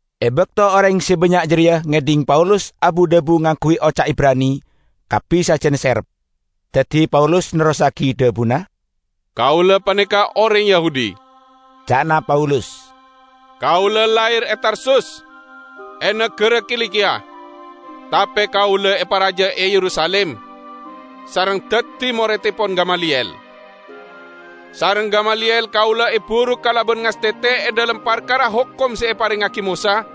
E bakto oreng se bannya' jareya ngedhing Paulus abu-dhabu ngangguy oca' Ibrani, kabbi sajan serep. Daddi Paulus nerrossagi dhabuna, "Kaula paneka oreng Yahudi," ca'na Paulus. "Kaula lahir e Tarsus e nagara Kilikiya, tape kaula eparaja e Yerusalim, sareng daddi morettepon Gamaliyel. Sareng Gamaliyel kaula eburuk kalaban ngastete e dhalem parkara hokom se eparengngagi Mosa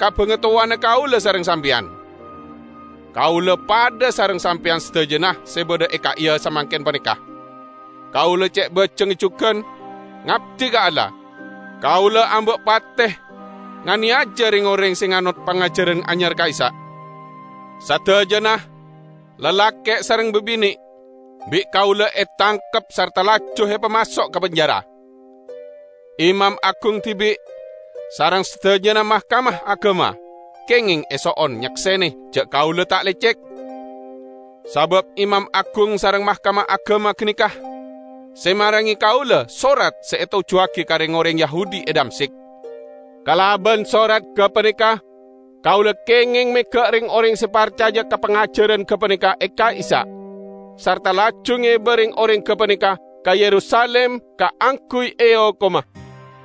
ka bangatowana kaula sareng sampeyan. Kaula padha sareng sampeyan sadajana se badha e ka'iya samangken paneka, kaula ce' bajengnga jugan ngabdi ka Allah. Kaula amba' pate nganeyaja reng-oreng se nganot pangajaran anyar ka'issa'. Sadajana, lalake' sareng babine', bi' kaula etangkep sarta laju epamaso' ka penjara. Imam agung dibi' sareng sadajana Mahkamah Agama kengeng eso'on nyaksene ja' kaula ta' lecek. Sabab imam agung sareng Mahkamah Agama ganeka se marenge kaula sorat se etojjuwagi ka reng-oreng Yahudi e Damsyik. Kalaban sorat gapaneka kaula kengeng mega' reng-oreng se parcaja ka pangajaran gapaneka e ka'issa', sarta laju ngeba reng-oreng gapaneka ka Yerusalim kaangguy eokoma."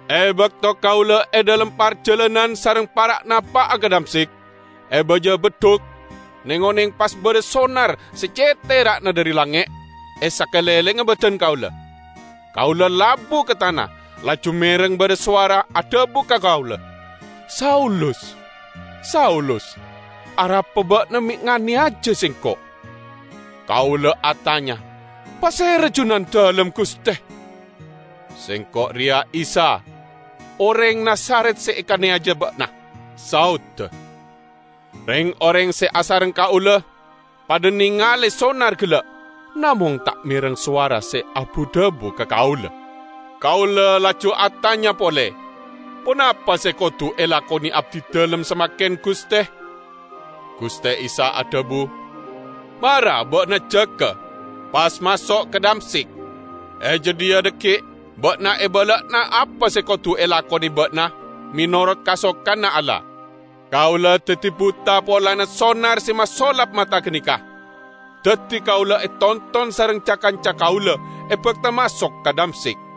"E bakto kaula e dhalem parjalanan sareng para' napa'a ka Damsyik, e baja beddhuk, neng-oneng pas badha sonar se ce' tera'na dhari langnge' e sakalenglengnga badan kaula. Kaula labu ka tana, laju mereng badha sowara adhabu ka kaula, 'Saulus, Saulus! Arapa ba'na me' nganeyaja Sengko'?' Kaula atanya, 'Pasera Junandalem, Guste?' 'Sengko' reya Isa oreng Nazaret se ekaneyaja ba'na,' saodda. Reng-oreng se asareng kaula padha nengale sonar gella', namong ta' mereng sowara se abu-dhabu ka kaula. Kaula laju atanya pole, 'Ponapa se kodu elakone abdidalem samangken, Guste?' Guste Isa adhabu, 'Mara ba'na jaga, pas maso' ka Damsyik. E jadhiya dhaggi' ba'na ebala'ana apa se kodu elakone ba'na menorot kasokanna Allah.' Kaula daddi buta polana sonar se masolap mata ganeka. Daddi kaula etonton sareng ca-kanca kaula, ebakta maso' ka Damsyik.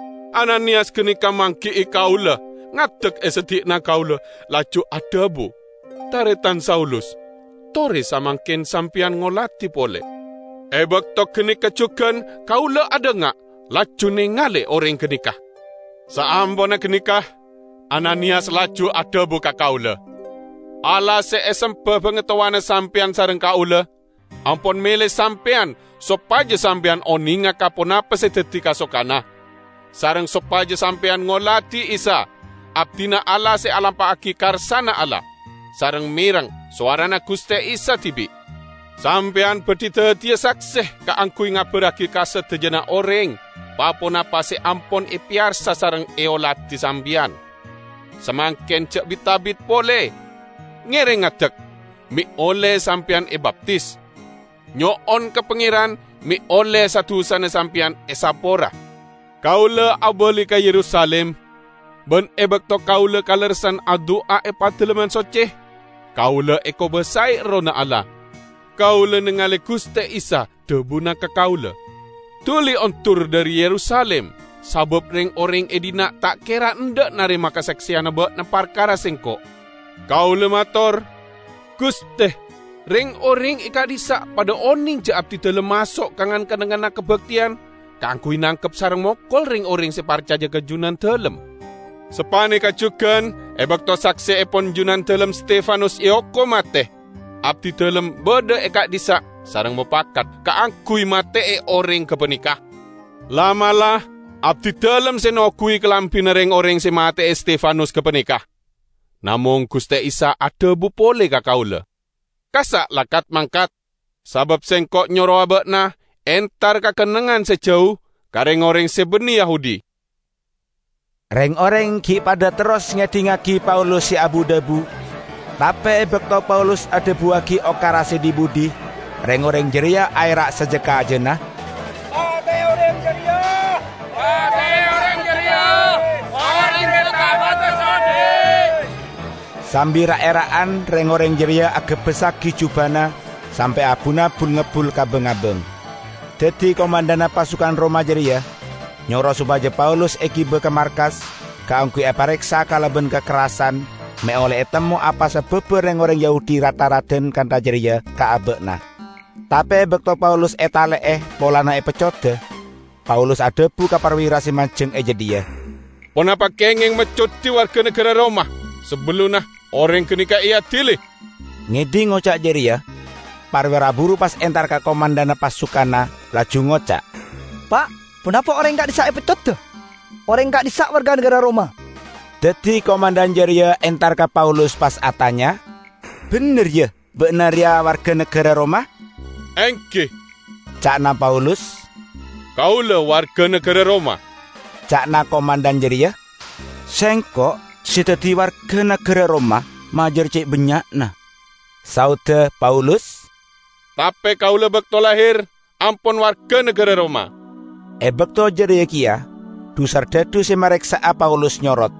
Ananiyas ganeka manggi'i kaula, ngadek e seddi'na kaula, laju adhabu, 'Taretan Saulus, tore samangken sampeyan ngoladi pole!' E bakto ganeka jugan kaula adhanga, laju nengale oreng ganeka. Saamponna ganeka Ananiyas laju adhabu ka kaula, 'Allah se esemba bangatowana sampeyan sareng kaula ampon mele sampeyan sopaja sampeyan onenga ka ponapa se daddi kasokanna, sareng sopaja sampeyan ngoladi Isa, Abdina Allah se alampa'agi karsana Allah, sareng mereng sowarana Guste Isa dibi'. Sampeyan badhi daddiya sakse kaangguy ngabarragi ka sadajana oreng pa-ponapa se ampon epeyarsa sareng eoladi sampeyan. Samangken ja' bit-abit pole. Ngereng ngadek, me' olle sampeyan ebaptis. Nyo'on ka Pangeran me' olle sa-dusana sampeyan esapora.' " "Kaula abali ka Yerusalim, ban e bakto kaula kalerressan adu'a e Padalemman Socce, kaula ekobasae Errohna Allah. Kaula nengale Guste Isa; dhabuna ka kaula, 'Duli ondur dhari Yerusalim, sabab reng-oreng e dhinna' ta' kera endha' narema kasakseyanna ba'na parkara Sengko'.' Kaula mator, 'Guste, reng-oreng e ka'dhissa' padha oneng ja' abdidalem maso' ka ngan-kennengnganna kabakteyan kaangguy nangkep sareng mokol reng-oreng se parcaja ka Junandalem. Sapaneka jugan e bakto sakseepon Junandalem Stefanus eokom mate, abdidalem badha e ka'dhissa' sareng mopakat kaangguy mate'e oreng gapaneka. La'-mala' abdidalem se noguwi kalambina reng-oreng se mate'e Stefanus gapaneka.' Namong Guste Isa adhabu pole ka kaula, 'Kassa' la kat-mangkat, sabab Sengko' nyorowa ba'na entar ka kennengngan se jau ka reng-oreng se banne Yahudi.' " Reng-oreng gi' padha terros ngedhingngagi Paulus se abu-dhabu, tape e bakto Paulus adhabuwagi okara se dhi-budhi reng-oreng jareya aera' saja-kajana, "Pate'e oreng jareya! Oreng jareya ta' pantes odhi'!" Sambi ra'-era'an reng-oreng jareya agebbessagi jubana sampe' abuna bul-ngebbul ka bang-abang. Daddi komandhanna pasukan Roma jareya nyoro sopaja Paulus egiba ka markas kaangguy epareksa kalaban kakerrasan me' olle etemmo apa sababba reng-oreng Yahudi rat-tharadan kantha jareya ka aba'na. Tape e bakto Paulus etale'e polana epeccoda, Paulus adhabu ka parwira se manjeng e jadhiya, "Ponapa kengeng meccodi warga nagara Roma sabellunna oreng ganeka eadili?" Ngedhing oca' jareya, parwira buru pas entar ka komandhanna pasukanna, laju ngoca', "Pa', ponapa oreng ka'dhissa' epeccoda? Oreng ka'dhissa' warga nagara Roma!" Daddi komandhan jareya entar ka Paulus pas atanya, "Bendher ya, ba'na reya warga nagara Roma?" "Enggi," ca'na Paulus, "kaula warga nagara Roma." Ca'na komandhan jareya, "Sengko' se daddi warga nagara Roma majar ce' bannya'na." Saodda Paulus, "Tape kaula bakto lahir ampon warga nagara Roma." E bakto jareya keya dhu-sardhadhu se mareksa'a Paulus nyorot,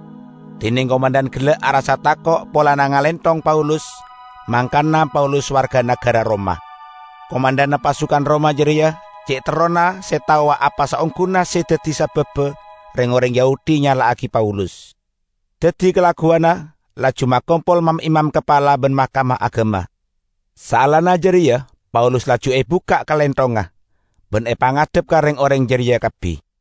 dineng komandhan gella' arassa tako' polana ngalenthong Paulus, mangkana Paulus warga nagara Roma. Komandhanna pasukan Roma jareya ce' terrona se taowa apa saongguna se daddi sababba reng-oreng Yahudi nyala'agi Paulus. Daddi kalagguwanna laju makompol mam-imam kapala ban Mahkamah Agama. Saellana jareya Paulus laju ebukka' kalenthongnga, ban epangadhep ka reng-oreng jareya kabbi.